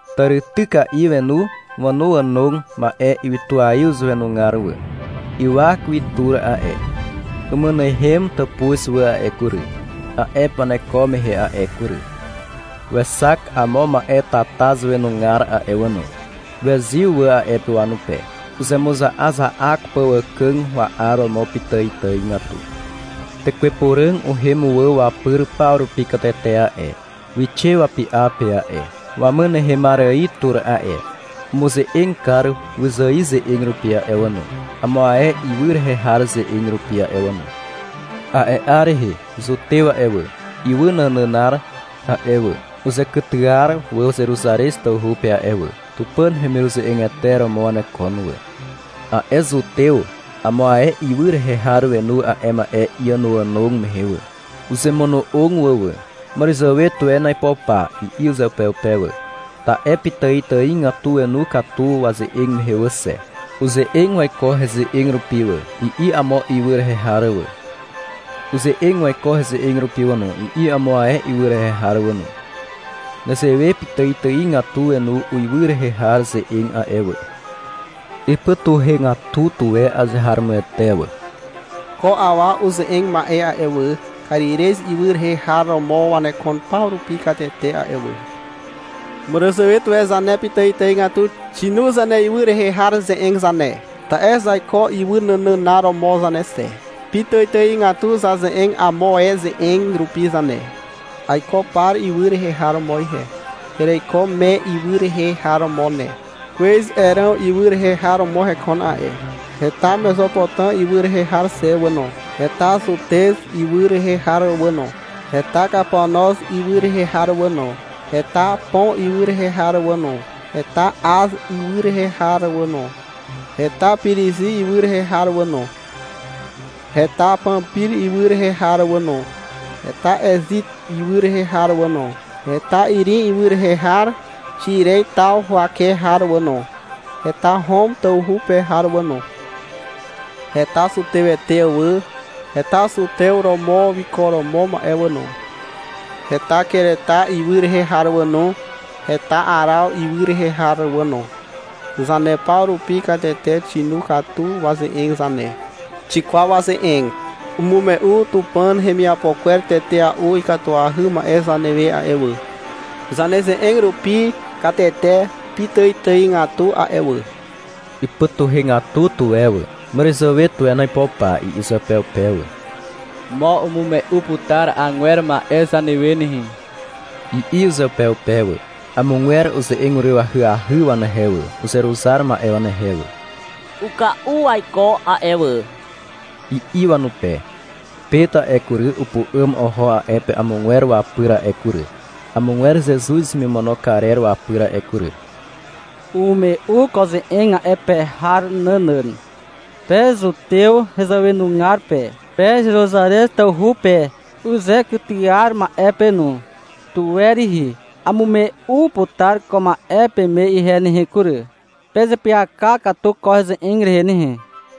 Tàrityka'i wenu wànoànog ma'e ywytuaiw zàwenugar wà. Ywak wi tur a'e. Umynehem tàpuz wà a'e kury, a'e pe waneko mehe a'e kury. Wexak amo ma'e tata zàwenugar a'e wà no. Wezyw wà a'e pe wanupe, uzemuza'aza'ak pà wàkàg wa'aromo pitàitàigatu. Tekwe Puràg uhem wà wapyr paw rupi katete a'e. Wixe wapy'a pe a'e, wamynehemar ài tur a'e. Umuze'eg kar wyzài ze'eg rupi a'e wà no, amo ae ywy rehe har ze'eg rupi a'e wà no. A'e 'ar rehe zutew a'e wà, ywy nànànar a'e wà, uzekytyar wà Zeruzarez tawhu pe a'e wà. Tupàn hemiruze'egete romo wanekon wà. A'e zutew amo ae ywy rehe har wenu a'e ma'e iànoànog mehe wà. Uzemono'og wà wà. — Màràzàwe tuwen aipo pa, i'i uzeupeupe wà. Ta'e pitàitàigatu wenu katu waze'eg mehe wà xe. — Uze'eg waiko heze'eg rupi wà, i'i amo ywy rehe har wà. — Uze'eg waiko heze'eg rupi wà no, i'i amo ae ywy rehe har wà no. Nezewe pitàitàigatu wenu uiwy rehe har ze'eg a'e wà. Ipytuhegatu tuwe azeharomoete wà. — Ko awa uze'eg ma'e a'e wà, Karirez ywy rehe har romo wanekon paw rupi katete a'e wà. Màràzàwe tuwe zane pitàitàigatu xinu zaneywy rehe har ze'eg zane. Ta'e zaiko ywy nànànar romo zane xe. Pitàitàigatu zaze'eg amo ae ze'eg rupi zane. Aiko Par ywy rehe har romo ihe. Ereiko Me ywy rehe har romo ne. Kwez Eràm ywy rehe har romo hekon a'e. Heta Mezopotàm ywy rehe har xe wà no, heta Zutez ywy rehe har wà no, heta Kapanoz ywy rehe har wà no, heta Pon ywy rehe har wà no, heta Az ywy rehe har wà no, heta Pirizi ywy rehe har wà no, heta Pampir ywy rehe har wà no, heta Ezit ywy rehe har wà no, heta Irim ywy rehe har Xiren taw huwake har wà no, heta Hom tawhu pe har wà no, heta zutewete wà, heta zutew romo wiko romo ma'e wà no, heta Kereta ywy rehe har wà no, heta Araw ywy rehe har wà no. Zane paw rupi katete xinu katu waze'eg zane. Xikwaw waze'eg. Umume'u Tupàn hemiapo kwer tetea'u ikatuahy ma'e zanewe a'e wà, zaneze'eg rupi katete pitàitàigatu a'e wà. Ipytuhegatu tuwe wà. — Màràzàwe tuwen aipo pà, i'i uzeupeupe wà. — Mo umume'u putar agwer ma'e zanewe nehe, i'i uzeupeupe wà. Amogwer uze'eg uryw ahyahy wanehe wà, uzeruzar ma'e wanehe wà. — Uka'u waiko a'e wà, i'i wanupe. Pet a'e kury, upu'àm oho a'e pe amogwer wapyr a'e kury, amogwer Zezuz hemimono karer wapyr a'e kury. Umume'u ko ze'eg a'e pe har nànàn. -Pe zutew hezàwenugar pe, pe Zeruzarez tawhu pe uzekytyar ma'e pe no. Tuwe rihi, amume'u putar ko ma'e peme ihe nehe kury. Pezeapyaka katu ko heze'eg rehe nehe.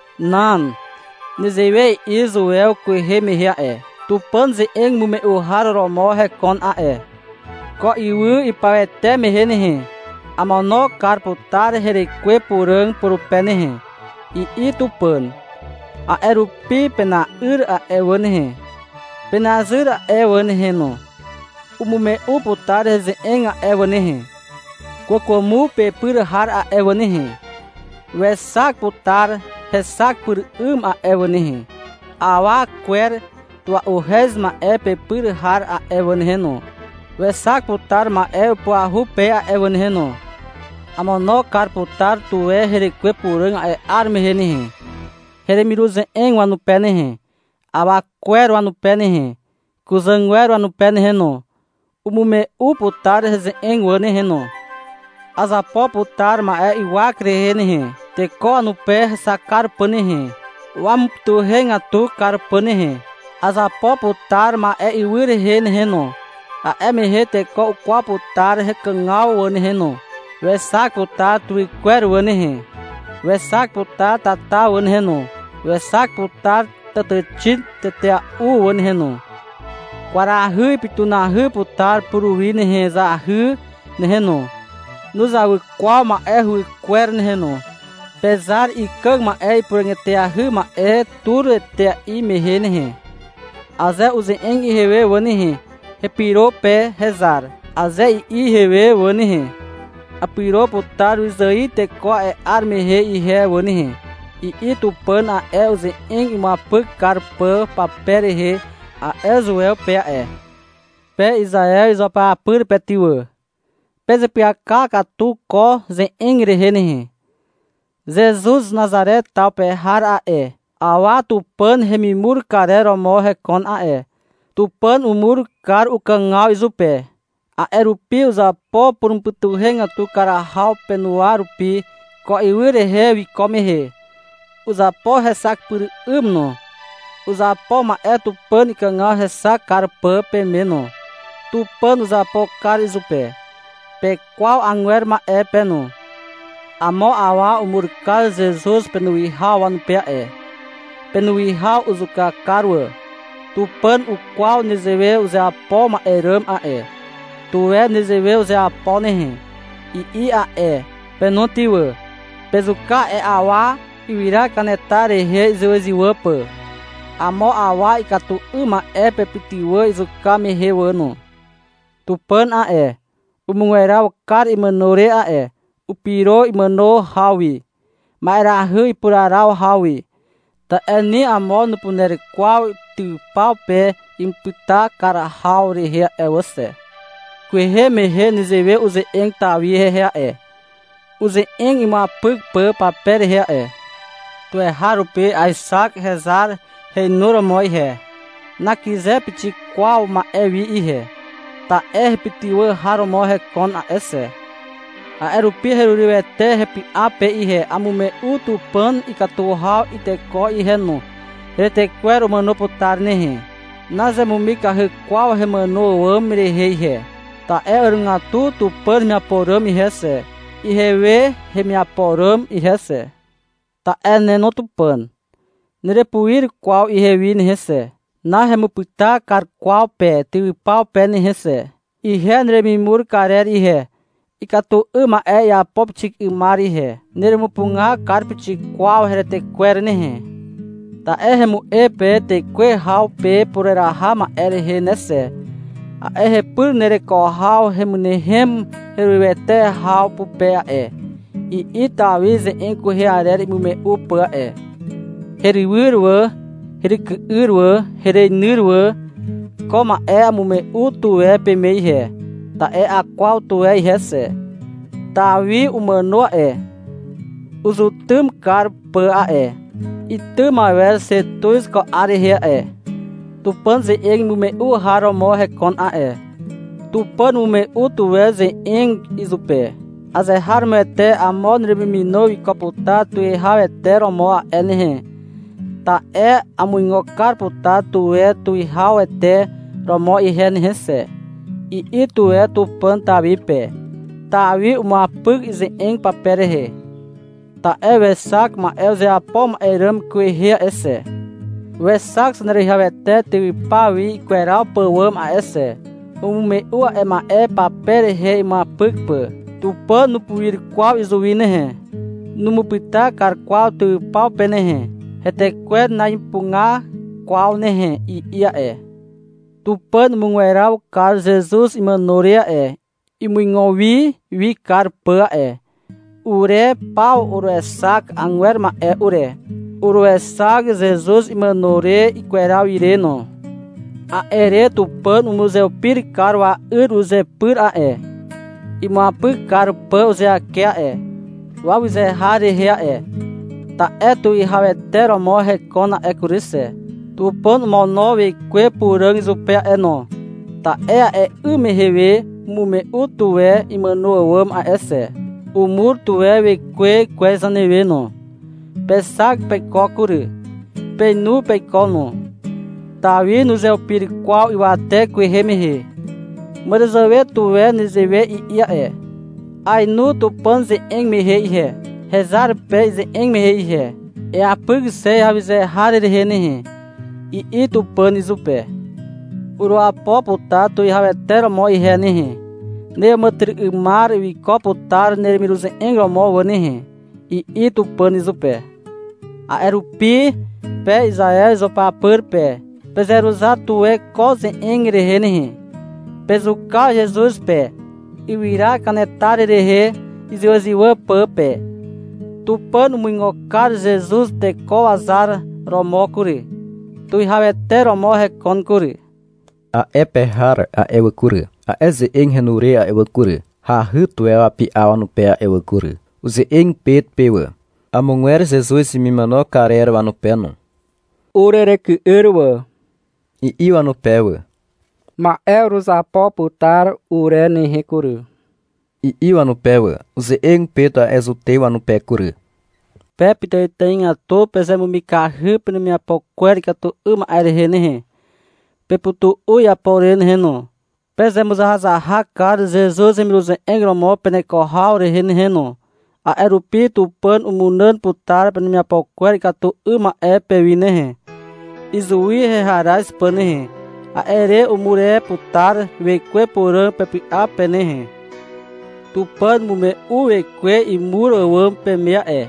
Nan. Nezewe i'i Zuew kwehe mehe a'e: (Tupàn ze'eg imume'u har romo hekon a'e). — Ko ywy ipawete mehe nehe, Amono kar putar herekwe Puràg purupe nehe, i'i Tupàn: — A'e rupi pena'yr a'e wà nehe, Penazyr a'e wà nehe no, Umume'u putar heze'eg a'e wà nehe, Kwàkwàmo pepyr har a'e wà nehe, wexak putar hexak pyr 'ym a'e wà nehe, Awa kwer tua'uhez ma'e pepyr har a'e wà nehe no, wexak putar ma'e upuahu pe a'e wà nehe no. Amono kar putar tuwe herekwe Puràg a'e 'ar mehe nehe, heremiruze'eg wanupe nehe, awa kwer wanupe nehe, kuzàgwer wanupe nehe no. Umume'u putar heze'eg wà nehe no. Azapo putar ma'e ywak rehe nehe, Teko wanupe hexak kar pà nehe, Wamupytuhegatu kar pà nehe. Azapo putar ma'e ywy rehe nehe no. A'e mehe teko ukwaw putar hekàgaw wà nehe no. Wexak putar tuwy kwer wà nehe, Wexak putar tata wà nehe no, Wexak putar tàtàxin tetea'u wà nehe no. Kwarahy ipytunahy putar puruwi nehe Zahy nehe no, nuzawy kwaw ma'e huwykwer nehe no, Pezar Ikàg Ma'e Ipuràg eteahy Ma'e tur etea'i mehe nehe. Aze uze'eg ihewe wà nehe, — Hepyro pe, hezar, Aze i'i ihewe wà nehe, Apyro putar wyzài teko a'e 'ar mehe ihe wà nehe, i'i Tupàn a'e, uze'eg imuapyk kar pà pape rehe a'e, Zuew pe a'e. Pe Izaew izuapyapyr pe ty wà, pezeapyaka katu ko ze'eg rehe nehe. Zezuz Nazare taw pe har a'e, awa Tupàn hemimur karer romo hekon a'e. Tupàn umur kar ukàgaw izupe. A'e rupi uzapo purumupytuhegatu kar haw penuwa rupi, ko ywy rehe wiko mehe. Uzapo hexak pyr 'ym no. Uzapo ma'e Tupàn ikàgaw hexak kar pà peme no. Tupàn uzapo kar izupe. Pekwaw agwer ma'e pe no. Amo awa umur kar Zezuz penuwihaw wanupe a'e. Penuwihaw uzuka kar wà. Tupàn ukwaw nezewe uzeapo ma'e ràm a'e. — Tuwe nezewe uzeapo nehe, i'i a'e. Pe no ty wà, pezuka a'e awa, ywyra kanetar rehe izywàzywà pà. Amo awa ikatu 'ym ma'e pepytywà izuka mehe wà no. Tupàn a'e, umugweraw kar imàno re a'e. Upyro imàno haw wi, ma'erahy ipuraraw haw wi. Ta'e ni amo nupuner kwaw tywypaw pe imupyta kar haw rehe a'e wà xe. Kwehe mehe nezewe uze'eg Tawi hehe a'e, uze'eg imuapyk pà pape rehe a'e. — Tuweharupi aexak hezar heinuromo ihe. Nakyze pixik kwaw ma'e wi ihe. Ta'e hepytywà har romo hekon a'e xe. A'e rupi herurywete hepy'a pe ihe Amume'u Tupàn ikatu haw iteko ihe no Heretekwer umàno putar nehe. Nazemumikahy kwaw hemàno àwàm rehe ihe. Ta'e àrogatu Tupàn hemiapo ràm ihe xe. Ihewe hemiapo ràm ihe xe. Ta'e ne no Tupàn, nerepuir kwaw ihewi nehe xe, Nahemupyta kar kwaw pe tywypaw pe nehe xe. Ihe neremimur kar ihe. Ikatu 'ym ma'e iapo pixik 'ymar ihe. Neremupuga kar pixik kwaw heretekwer nehe. Ta'e hemu'e pe tekuwe haw pe pureraha ma'e rehe ne xe. A'e hepyr nereko haw hemynehem herurywete haw pupe a'e, i'i Tawi ze'eg kwehe arer imume'u pà a'e. Herywyr wà, heryky'yr wà, hereinyr wà. Ko ma'e amume'u tuwe peme ihe, ta'e akwaw tuwe ihe xe. Tawi umàno a'e, uzetym kar pà a'e. Itym awer xe tuz ko 'ar rehe a'e. Tupàn ze'eg imume'u har romo hekon a'e. Tupàn umume'u tuwe uze'eg izupe. -Azeharomoete amo neremimino wiko putar tuwihawete romo a'e nehe, ta'e amuigo kar putar tuwe tuwihawete romo ihe nehe xe, i'i tuwe Tupàn Tawi pe. Tawi umuapyk ize'eg pape rehe. Ta'e wexak ma'e uzeapo ma'e ràm kwehe a'e xe. Wexak Zaneruwihawete tywypaw wi ikweraw pàwàm a'e xe. Umume'u a'e ma'e pape rehe imuapyk pà. Tupàn nupuir kwaw izuwi nehe, numupyta kar kwaw tywypaw pe nehe. Hetekwer na'ipuga kwaw nehe, i'i a'e. Tupàn umugweraw kar Zezuz imàno re a'e, imuigo wi wi kar pà a'e. Ure paw uruexak agwer ma'e ure, uruexak Zezuz imàno re ikweraw ire no. A'e re Tupàn umuzeupir kar wa'yr uzepyr a'e, imuapyk kar pà uzeake a'e, wawyze har rehe a'e. Ta'e Tuwihawete romo hekon a'e kury xe. Tupàn omono Wekwe Puràg izupe a'e no, ta'e a'e 'ym mehe we umume'u tuwe imono àwàm a'e xe. Umur tuwe Wekwe kwez zanewe no. Pexak peiko kury. Peinu peiko no. Tawi nuzeupir kwaw ywate kwehe mehe. Màràzàwe tuwe nezewe i'i a'e. — Aenu Tupàn ize'eg mehe ihe, hezar pe ize'eg mehe ihe. — Eapyk xe heawyze har rehe nehe, i'i Tupàn izupe. — Uruapo putar tuwihawete romo ihe nehe. Neàmàtyry'ymar wiko putar neremiruze'eg romo wà nehe, i'i Tupàn izupe. A'e rupi, pe Izaew izuapyapyr pe. Pezeruzar tuwe ko ze'eg rehe nehe. Pezuka Zezuz pe, ywyra kanetar rehe izywàzywà pà pe. Tupàn umuigo kar Zezuz teko wazar romo kury. Tuwihawete romo hekon kury. A'e pe har a'e wà kury, a'e ze'eg henu re a'e wà kury, hahy tuwe wapy'a wanupe a'e wà kury. Uze'eg Pet pe wà, amogwer Zezuz hemimono karer wanupe no. -Ureryky'yr wà, i'i wanupe wà. — Ma'e uruzapo putar ure nehe kury, i'i wanupe wà. Uze'eg Pet a'e zutew wanupe kury. -Pe pitàitàigatu pezemumikahy penemiapo kwer ikatu 'ym ma'e rehe nehe. Pepytu'u iapo re nehe no. Pezemuzahazahak kar Zezuz hemiruze'eg romo peneko haw rehe nehe no. A'e rupi Tupàn umunàn putar penemiapo kwer ikatu 'ym ma'e pewi nehe, izuwi heharaz pà nehe. A'e re umur e putar Wekwe Puràg pepy'a pe nehe. Tupàn umume'u Wekwe imur àwàm peme a'e,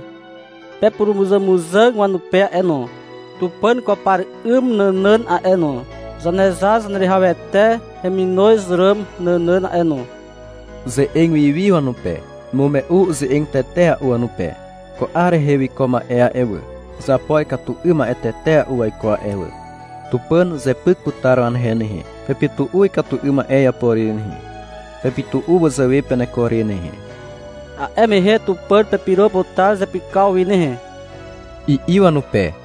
pepurumuzàmuzàg wanupe a'e no, Tupàn kwaw par 'ym nànàn a'e no, Zanezar Zaneruwihawete heminoz ràm nànàn a'e no. Uze'eg wi wi wanupe, umume'u uze'eg tetea'u wanupe. -Ko 'ar rehe wiko ma'e a'e wà, uzapo ikatu 'ym ma'e tetea'u waiko a'e wà. Tupàn uzepyk putar wanehe nehe. Pepytu'u ikatu 'ym ma'e iapo re nehe. Pepytu'u wazàwe peneko re nehe. A'e mehe Tupàn pepyro putar zepykaw wi nehe, i'i wanupe.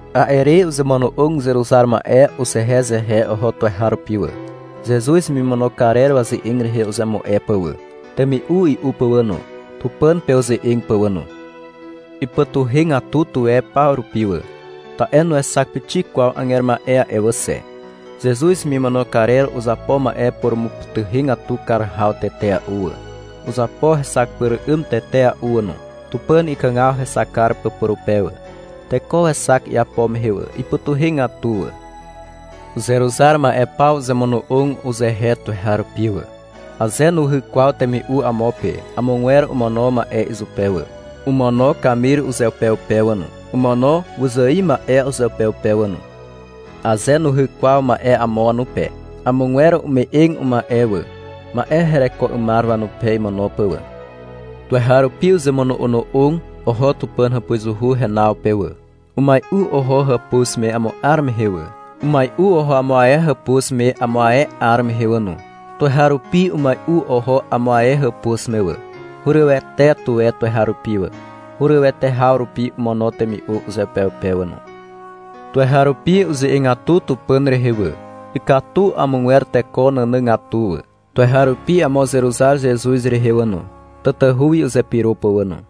A'e re uzemono'og uzeruzar ma'e uzehezehe oho tuweharupi wà, Zezuz hemimono karer waze'eg rehe uzemu'e pà wà, temi'u i'u pà wà no, Tupàn pe uze'eg pà wà no. Ipytuhegatu tuwe paw rupi wà, ta'e nuexak pixik kwaw agwer ma'e a'e wà xe. Zezuz hemimono karer uzapo ma'e purumupytuhegatu kar haw tetea'u wà, uzapo hexak pyr 'ym tetea'u wà no, Tupàn ikàgaw hexak kar pà purupe wà. Teko wexak iapo mehe wà. Ipytuhegatu wà. Uzeruzar ma'e paw uzemono'og uzehe tuweharupi wà. Aze nuhyk kwaw temi'u amo pe, amogwer omono ma'e izupe wà. Omono kamir uzeupeupe wà no, omono wyzài ma'e uzeupeupe wà no. Aze nuhyk kwaw ma'e amo wanupe, amogwer ume'eg uma'e wà, ma'e hereko 'ymar wanupe imono pà wà. Tuweharupi uzemono'ono'og oho Tupàn hàpuzuhu renaw pe wà. Umai'u oho amo hàpuz me amo 'ar mehe wà. Umai'u oho amo ae hàpuz me amo ae 'ar mehe wà no. Tuweharupi umai'u oho amo ae hàpuz me wà. Hurywete tuwe tuweharupi wà. Urywete haw rupi omono temi'u uzeupeupe wà no. Tuweharupi uze'egatu Tupàn rehe wà. Ikatu amogwer teko nànàgatu wà. Tuweharupi amo uzeruzar Zezuz rehe wà no, tatahu wi uzepyro pà wà no.